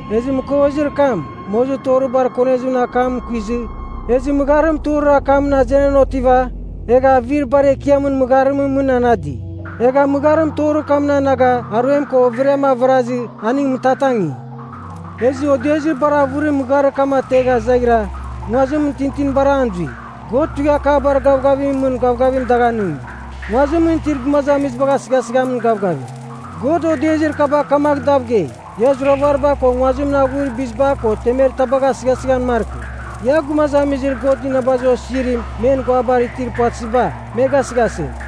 Ezɨ mɨkovezir kam, mozir torir bar konezimɨn akam kuizɨ, ezɨ mɨgharim torir akamɨn azenan otiva, egha avir bar ekiamɨn mɨgharimɨn mɨn anadi. Egha mɨgharim torir kamɨn anaga aruem ko overiam avarazɨ, aning mɨtatangi. Ezɨ odezir bar avɨrim mɨgharir kam ategha zaghira, nguazim tintinibar an zui. God tuighakabar gavgavimɨn mɨn gavgavim dagh anɨngi, nguazimɨn itir gumazamizibagh asɨghasɨghamin gavgavim. God odezir kaba kamagh dav gei, “Ia zuravariba ko nguazimɨn aghuir biziba ko temer tabagh asɨghasɨghan markɨ. Ia, gumazamizir God inabazir osizirim men guabar itir puvatɨziba, me gasɨghasɨgh.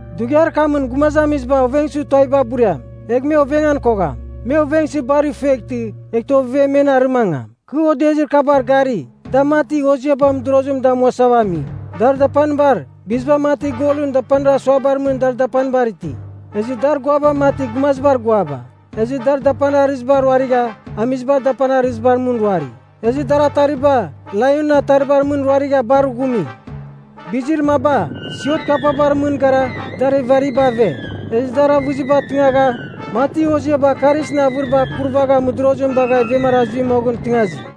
Dughiar kamɨn gumazamiziba ovengsɨ tuaviba buriam, egh me ovengan kogham. Me ovengsɨ bar ifueghtɨ, eghtɨ ovevem men arɨmangam. Kɨ odezir kabar gari, da mati hoziaba mɨdorozim damuasava ami. Dar dapanibar, biziba mati golɨn dapanir asuabar mɨn dar dapanibar iti. Ezɨ dar guaba mati gumazibar guaba. Ezɨ dar dapanir arɨziba ruarigha, amizibar dapanir arɨzibar mɨn ruari. Ezɨ dar atariba, laionɨn ataribar mɨn, ruarigha bar ghumi. Bizir maba, siot kapabar mɨn gara, dar evariba ave. Ezɨ dar avɨziba tɨngagha mati hoziaba karisɨn avɨriba kurvagha mɨdorozim bagha ivemara zui moghɨn tɨngazi.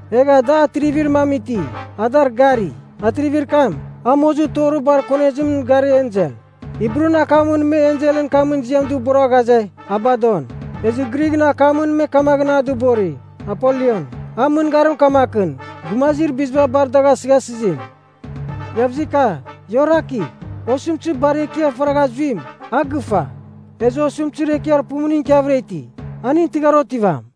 Egha da atrivir mam iti, a dar gari. Atrivir kam, a mozir torir bar konezimɨn garir ensel. Hibrun akamɨn me enselɨn kamɨn ziam dɨbora ghaze, “Abadon.” Ezɨ Grighɨn akamɨn me kamaghɨn a dɨbori, “Apoliyon.” An mɨngarim kamakɨn, gumazir biziba bar dagh asɨghasɨzim. Iavzika, ia orakigh! Osɨmtɨzir bar ekiar faragh zuim, a gɨfa. Ezɨ osɨmtɨzir ekiar pumuning ikiavɨra iti, aning tɨghar otivam.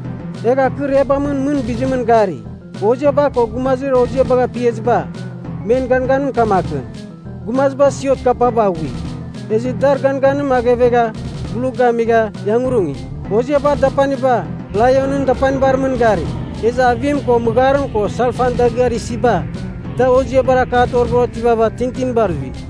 Egha kɨ irebamɨn mɨn bizimɨn gari, hoziaba ko gumazir hoziabagh apiaziba, men ganganim kamakɨn. Gumaziba siot kapaba aghui, ezɨ dar ganganim aghevegha, blu gamigha, iangurungi. Hoziabar dapaniba, laionɨn dapanibar mɨn gari. Ezɨ avim ko mɨgharim ko salfan dagɨar isiba, da hoziabar akabar otivava tintinibar zui.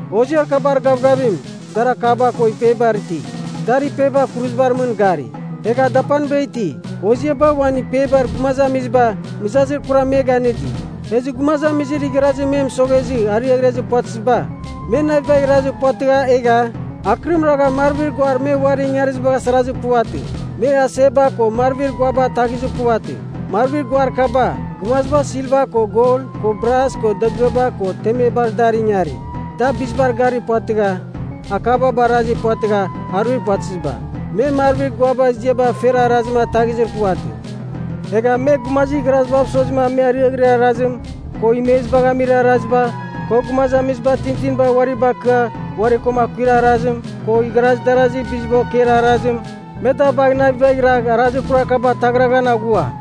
Hoziar kabar gavgavim, dar akaba ko ipebar iti. Dar ipeba kuruzibar mɨn gari, egha dapaniba iti. Hoziaba uan ipebar gumazamiziba mɨzazir kuram me ganɨdi. Ezɨ gumazamizir igharazir me mɨsoghezɨ, ariaghrezir puvatɨziba, me navibagh irazir puvatɨgha egha, akɨrim ragha marvir guar me uari ingarizibagh asarazir puvatɨ. Me aseba ko marvir guaba ataghizir puvatɨ. Marvir guar kaba, gumaziba silva ko gol ko bras ko dagɨaba ko temebar dar ingari, da bizibar garir puvatɨgha akaba barazir puvatɨgha aruir puvatɨziba. Me marvir guabar ziaba fer arazim ataghizir puvatɨ. Egha me, gumazir igharazibav sozima me ariaghirir arazim, ko imezibagh amir araziba, ko gumazamiziba tintinibar uari bakɨa uari ko akuir arazim, ko igharaz darazir biziba okeir arazim, me da bagh navibagh iragh arazir kurar kaba ataghraghan aghua.